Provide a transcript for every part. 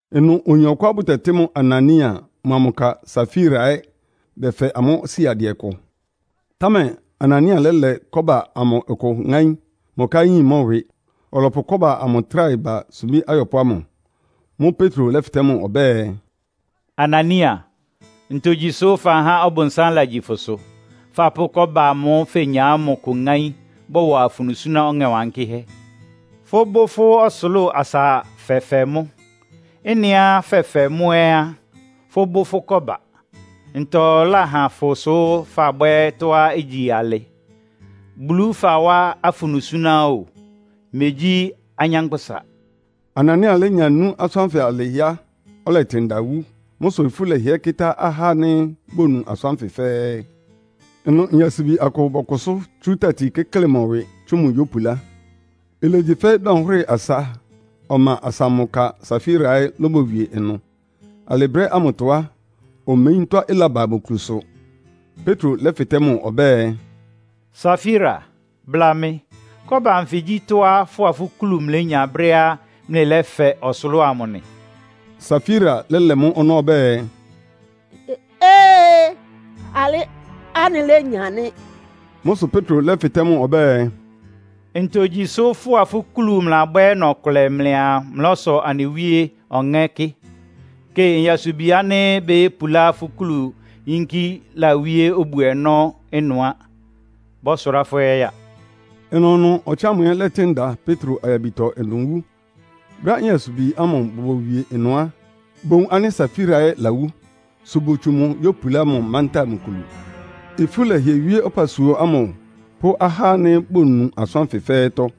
Ɩnʋ oyin ɔkʋá bʋtɛtɩ́ mʋ Anania mʋa mʋ ka Safira ɛ́ bɛfɛ amʋ́ siadɩɛ kʋ. Támɛ Anania lɛ́lɛ kɔ́ba amʋ kʋ ŋáín, mʋ ka ɛ́ yin mʋ́ ɩwɩ. Ɔlɔpʋ kɔ́ba amʋ tráhɛ ba sumbí ayɔpʋ́ ámʋ. Mʋ́ʋ́ Petro lɛ́fɩtɛ́ mʋ ɔbɛ́ɛ, “Anania, ntogyi sʋ́ fahá Ɔbʋnsám lagyi fʋsʋ, fapʋ́ kɔ́ba amʋ́ʋ́ fenya ámʋ kʋ ŋáín, bɔ́wa afunu suná Ɔŋɛ Wankɩ́hɛ́? Fʋ́bʋ́ fʋ́ ɔsʋlʋ́ʋ asa fɛfɛ mʋ́. Ɩ́nɩá fɛfɛ mʋ́ ɛ́ á, fʋ́bʋ́ fʋ́ kɔ́ba. Ntɔ láhan fʋ sʋ́ fabwɛ́ ɩtɔ́á igyi alɩ? Bulu fawá afunu súná o, megyí anyánkpʋ́sa.” Anania lénya nú asʋ́n ánfɩ alɩ á, ɔlɛtɩn da wú. Mʋ́ sʋ ifú lɛhɩɛ kɩ́tá ahá ánɩ́ bonu asʋ́n ánfɩ fɛ́ɛ́. Ɩnʋ nyasubi akʋ bɔkʋsʋ́ tsú tati kɩ́klɩ mʋ ɩwɩ, tsú mʋ yópulá. Ilegyi fɛ́ dɔnhwɩ́rɩ asa ɔma asa mʋ ka Safira ɛ́ lóbowie ɩnʋ. Alɩ brɛ́ ámʋtɔ á, omeyín tɔ́á ɩlaba mʋ kulusʋ. Petro lɛ́fɩtɛ́ mʋ ɔbɛ́ɛ, “Safira, bla mɩ. Kɔ́ba anfɩ gyí tɔ́á fʋ́a fʋ́ kulu mlɩlénya brɛ́á mlɩlɛ́fɛ ɔsʋlʋ́ʋ amʋ nɩ?” Safira lɛ́lɛ mʋ́ ɔnɔ́ ɔbɛ́ɛ, “Ee, alɩ anɩlénya nɩ́.” Mʋ́ sʋ Petro lɛ́fɩtɛ́ mʋ ɔbɛ́ɛ, “Ntogyi sʋ fʋ́a fʋ́ kulu mlɩlabwɛ́ ɔnɔ-ɔkʋlɛ mlɩaa mlɔ́sɔ Anɩ Wíe Ɔŋɛ́ kɩ? Kɩ, nyasubi ánɩ́ bayópulá fʋ́ kulu yínkí lawíé obu-ɔnɔ́ ɩnʋ á. Bɔ́sʋrá fʋ́ ɛ́ ya.” Ɩnʋnʋ ɔtsɩ ámʋ ɛ́ lɛ́tɩn da Petro ayabitɔ ɩnʋ wú. Brɛ́á nyasubi ámʋ bobowie ɩnʋ á, bowun ánɩ́ Safira ɛ́ lawú, sʋ botsu mʋ yópulá mʋ mantáa mʋ kulu. Ifú lɛhɩɛ wíé ɔpasua ámʋ pʋ́ ahá ánɩ́ bonu asʋ́n ánfɩ fɛ́ɛ́tɔ́.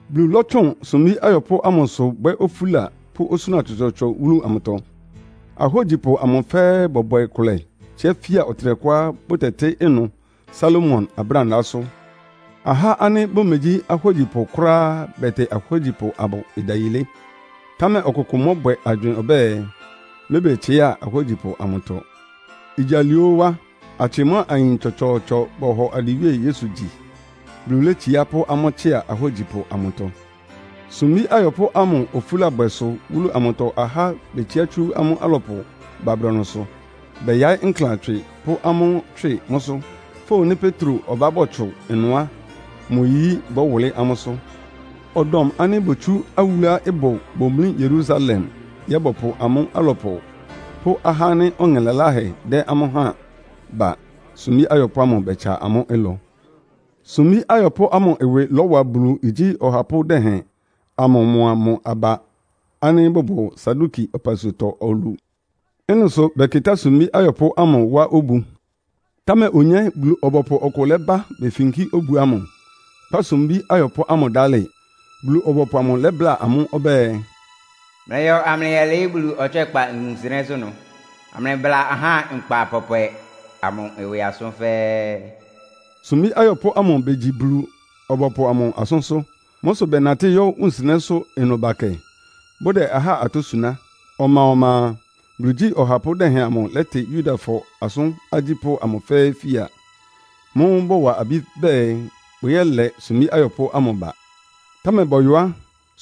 Bulu lɔ́tsʋn sumbí ayɔpʋ́ ámʋsʋ bwɛ́ ofúla pʋ́ osúna tsɔtsɔɔtsɔ wúlu amʋtɔ. Ahógyipʋ amʋ fɛ́ɛ́ bɔbwɛ kʋlɛ tsíá fia ɔtɩnɛkʋá bʋtɛtɩ́ ɩnʋ Salomo Abrándaásʋ́. Ahá ánɩ́ bʋmegyí ahógyipʋ kʋ́ráá bɛtɩ ahógyipʋ amʋ ɩdayilé. Támɛ ɔkʋkʋ mɔ́bwɛ agywɩɩn ɔbɛ́ɛ, mɛ́bɛtsɩá ahógyipʋ amʋtɔ. Igyi alɩ óó á, atsɩ mʋ́a ayin tsɔtsɔɔtsɔ bɔhɔ anɩ Wíe Yesu gyi. Bulu létsiá pʋ́ amʋ́ tsɩ́a ahógyipʋ amʋtɔ. Sumbí ayɔpʋ́ ámʋ ofúlábwɛ sʋ wúlu amʋtɔ ahá betsiá tsú amʋ́ alɔpʋ ba brɔnʋsʋ, bɛyaɩ́ nklan tswɩ pʋ́ amʋ́ tswɩ mʋ́sʋ́. Fówun nɩ́ Petro ɔbá bɔtsʋn ɩnʋ á, mʋ yiyí bɔ́wʋlɩ́ amʋ́sʋ́. Ɔdɔm ánɩ́ botsú awúluá ɩbʋ bomlí Yerusalemtɔ ɛ́ bɔpʋ amʋ́ alɔpʋ pʋ́ ahá ánɩ́ ɔŋɛ laláhɛ dɛ́ amʋ́ háan ba, sumbí ayɔpʋ́ ámʋ bɛtsa amʋ́ ɩlɔ. Sumbí ayɔpʋ́ ámʋ ɩwɩ lɔ́wa Bulu igyí ɔhapʋ́ dɛhɛn amʋ mʋa mʋ aba ánɩ́ bʋbʋ Saduki ɔpasuatɔ olu. Ɩ́nɩ sʋ bɛkɩtá sumbí ayɔpʋ́ ámʋ wá obu. Támɛ onyé, Bulu-ɔbɔpʋ ɔkʋ lɛ́ba befinkí obu ámʋ, kpá sumbí ayɔpʋ́ ámʋ dálɩ. Bulu-ɔbɔpʋ amʋ lɛ́bláa amʋ́ ɔbɛ́ɛ, “Mlɩyɔ amlɩyɛlɩɩ́ Bulu ɔtswɛ́kpa wunsɩnɛ́sʋ́ ɩnʋ, amlɩbla ahá nkpa pɔpwɛ amʋ ɩwɩ asʋ́n fɛ́ɛ́.” Sumbí ayɔpʋ́ ámʋ begyi Bulu-ɔbɔpʋ amʋ asʋ́nsʋ́. Mʋ́ sʋ bɛnatɩ́ yɔ́ wunsɩnɛ́sʋ́ ɩnʋ bakɛ, bʋdɛ ahá atɔ́ suná. Ɔma-ɔma a, Bulu igyí ɔhapʋ́ dɛhɛn amʋ lɛ́tɩ Yudafɔ asʋ́n agyípʋ́ amʋ fɛ́ɛ́ fia. Mʋ́ʋ́ bɔwa abí bɛɛ bʋyɛ́lɛ sumbí ayɔpʋ́ ámʋ ba. Támɛ bɔyɔ á,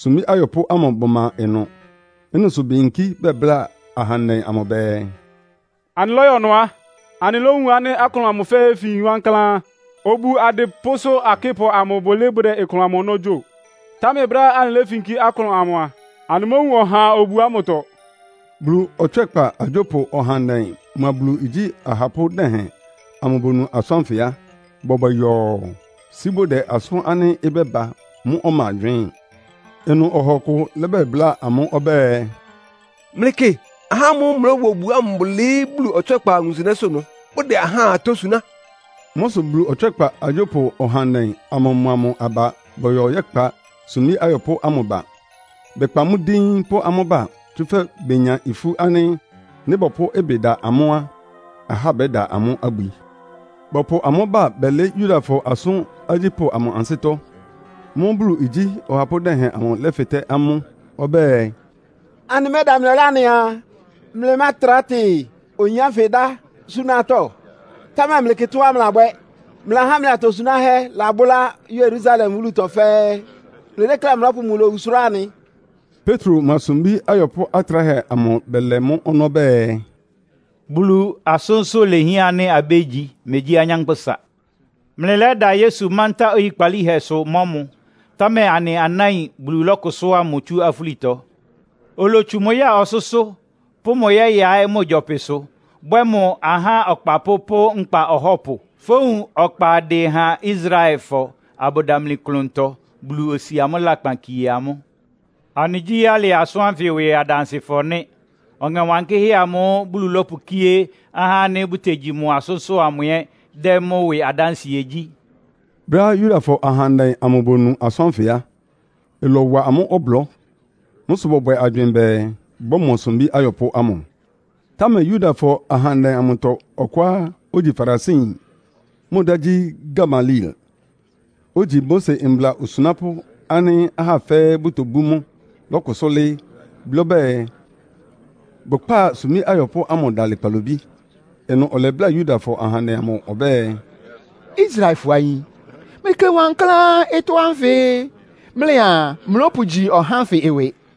sumbí ayɔpʋ́ ámʋ bʋma ɩnʋ. Ɩ́nɩ sʋ beyinkí bɛbláa ahandɛ amʋ bɛɛ, “Anɩlɔ́yɔ ɩnʋ á, anɩlówun ánɩ́ aklʋn amʋ fin wankláán. Obu adɩpʋ́sʋ́ akɩ́pʋ amʋ bʋlɩɩ́ bʋdɛ aklʋn amʋ ɔnɔ́ gyo. Támɛ brɛ́á anɩléfinkí aklʋn amʋ a, anɩmówun ɔhaa obu ámʋtɔ.” Bulu ɔtswɛ́kpa agyópʋ ɔhandɛ mʋa Bulu igyí ahapʋ́ dɛhɛn amʋ bonu asʋ́n ánfɩ a, bɔbwɛ yɔɔ, sí bʋdɛ asʋ́n ánɩ́ ɩbɛ́ba mʋ́ ɔma gywɩɩ́n. Ɩnʋ ɔha ɔkʋ lɛ́bɛbláa amʋ́ ɔbɛ́ɛ, “Mlɩkɩ, ahá ámʋ́ʋ́ mlɩlɔ́wa obu ámʋ bʋlɩɩ́ Bulu ɔtswɛ́kpa wunsɩnɛ́sʋ́ ɩnʋ, bʋdɛ ahá atɔ́ suná.” Mʋ́ sʋ Bulu ɔtswɛ́kpa agyópʋ ɔhandɛ amʋ mʋa mʋ aba bɔyɔ yɛ́kpa sumbí ayɔpʋ́ ámʋ ba. Bɛkpa amʋ́ díín pʋ́ amʋ́ ba, tsúfɛ́ benya ifú ánɩ́ nɩ́ bɔpʋ́ ɩbɩ da amʋ́ á, ahá bɛ́da amʋ́ abwi. Bɔpʋ amʋ́ ba bɛlɩɩ́ Yudafɔ asʋ́n agyípʋ́ amʋ ansɩ́tɔ́. Mʋ́ʋ́ Bulu igyí ɔhapʋ́ dɛhɛn amʋ lɛ́fɩtɛ́ amʋ́ ɔbɛ́ɛ, “Anɩmɛ́da mlɩ ɔlá anɩaa, mlɩmátrá tɩ oyin ánfɩ dá súná atɔ́? Támɛ mlɩkɩ tɔ́á mlɩlabwɛ́. Mlɩlahá mlɩ atosunáhɛ́ labʋ́lá Yerusalem wúlutɔ fɛ́ɛ́. Mlɩdékléá mlɔ́pʋ mʋ lowu sʋ́rá anɩ.” Petro mʋa sumbí ayɔpʋ́ atráhɛ amʋ bɛlɛ mʋ́ ɔnɔ́ bɛɛ, “Bulu asʋ́nsʋ́ lehián ánɩ́ abégyi, megyí anyánkpʋ́sa. Mlɩlɛ́da Yesu mántá oyikpalíhɛsʋ mɔ́ mʋ. Támɛ anɩ anáin Bulu lɔ́kʋsʋ́a mʋ tsú afúlitɔ. Olotsu mʋ ya ɔsʋ́sʋ́, pʋ́ mʋ yɛ́yaɩ́ mʋ gyɔpɩsʋ, bwɛ́ mʋ ahá Ɔkpapʋ́ pʋ́ Nkpa Ɔhɔ́pʋ. Fówun ɔkpa ɩdɩ ha Israelfɔ abʋdamli klʋntɔ, Bulu osi amʋ́ lakpan kie amʋ́. Anɩgyí alɩ asʋ́n ánfɩ ɩwɩ adansɩfɔ nɩ́. Ɔŋɛ Wankɩ́hɛ́ amʋ́ʋ́ Bulu lɔ́pʋkíé ahá ánɩ́ bʋtegyi mʋ asʋ́nsʋ́ amʋ ɛ́ dɛ́ mʋ́ ɩwɩ adánsɩɛ gyí.” Brɛ́á Yudafɔ ahandɛ amʋ bonu asʋ́n ánfɩ á, ɩlɔwa amʋ́ ɔblɔ́. Mʋ́ sʋ bɔbwɛ agywɩɩn bɛɛ, bɔ́mɔ sumbí ayɔpʋ́ ámʋ. Támɛ Yudafɔ ahandɛ amʋtɔ ɔkʋá ogyi Farisiyin, mʋ dá gyí Gamaliel, ogyi Mose mbla osunápʋ́ ánɩ́ ahá fɛ́ɛ́ bʋtobú mʋ lɔ́kʋsʋ́ lɩ́ɩ́, blɩ́ ɔbɛ́ɛ bʋkpá sumbí ayɔpʋ́ ámʋ dalɩ kpalobí. Ɩnʋ ɔlɛbláa Yudafɔ ahandɛ amʋ ɔbɛ́ɛ, “Israelfɔ ayin, mlɩkɩ wankláán ɩtɔ́ ánfɩ mlɩaa mlɔ́pʋgyi ahá ánfɩ ɩwɩ.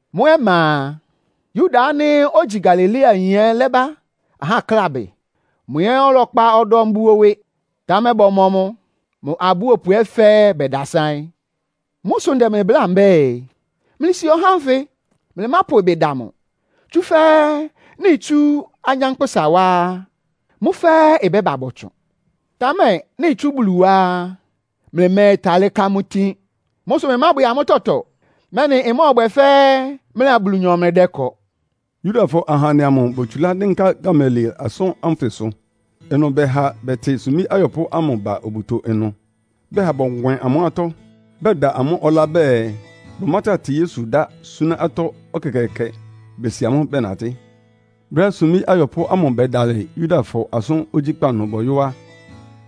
Mʋ ɔma a, Yuda ánɩ́ ogyi Galileayin ɛ́ lɛ́ba aháklábɩ. Mʋ ɛ́ ɔlɛkpa ɔdɔm buo ɩwɩ. Támɛ bɔmɔ mʋ, mʋ abúopʋ amʋ fɛ́ɛ́ bɛdasáɩ́n. Mʋ́ sʋ ndɛ mlɩ bláa mbɛ́ɛ, mlɩsi ahá ánfɩ. Mlɩmápʋ ɩbɩ da amʋ́. Tsúfɛ́ nɩ́ itsú anyánkpʋ́sa wá á, mʋ́ fɛ́ɛ́ ɩbɛ́ba bɔtsʋn. Támɛ nɩ́ itsú Bulu wá á, mlɩmɛ́ɛtalɩ́ ká amʋ́ itin. Mʋ́ sʋ mlɩmábwɛ amʋ́ tɔtɔ, mɛ́nɩ ɩmɔ́ɔbwɛ fɛ́ mlɩa Bulunyɔ mlɩdɛ́kɔ.” Yudafɔ ahandɛ amʋ botsulá dɩ́nká Gamaliel asʋ́n ánfɩsʋ. Ɩnʋ bɛha bɛtɩ sumbí ayɔpʋ́ ámʋ ba obuto ɩnʋ. Bɛha bɔnwɛn amʋ́ atɔ́, bɛda amʋ́ ɔlá bɛɛ, bʋmátra tɩ Yesu dá súná atɔ́ ɛkɛkɛɛkɛ, besi amʋ́ bɛnatɩ́. Brɛ́á sumbí ayɔpʋ́ ámʋ bɛdalɩ Yudafɔ asʋ́n ogyíkpa ɩnʋ bɔyɔ́ á,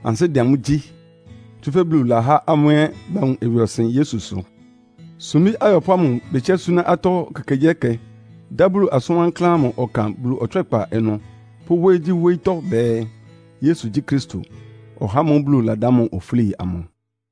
ansɩ́ dɛ amʋ́ gyí. Tsúfɛ́ Bulu lahá amʋ́ ɛ́ bawun ɩwɩɔsɩn Yesu sʋ. Sumbí ayɔpʋ́ ámʋ betsiá súná atɔ́ ekekegyíɛkɛ, dá Bulu asʋn wankláán ámʋ ɔkan Bulu ɔtswɛ́kpa ɩnʋ pʋ́ wóyígyíwóyítɔ́ bɛɛ, Yesu gyí Kristo, (ɔhá ámʋ́ʋ́ Bulu ladá mʋ ofúli amʋ).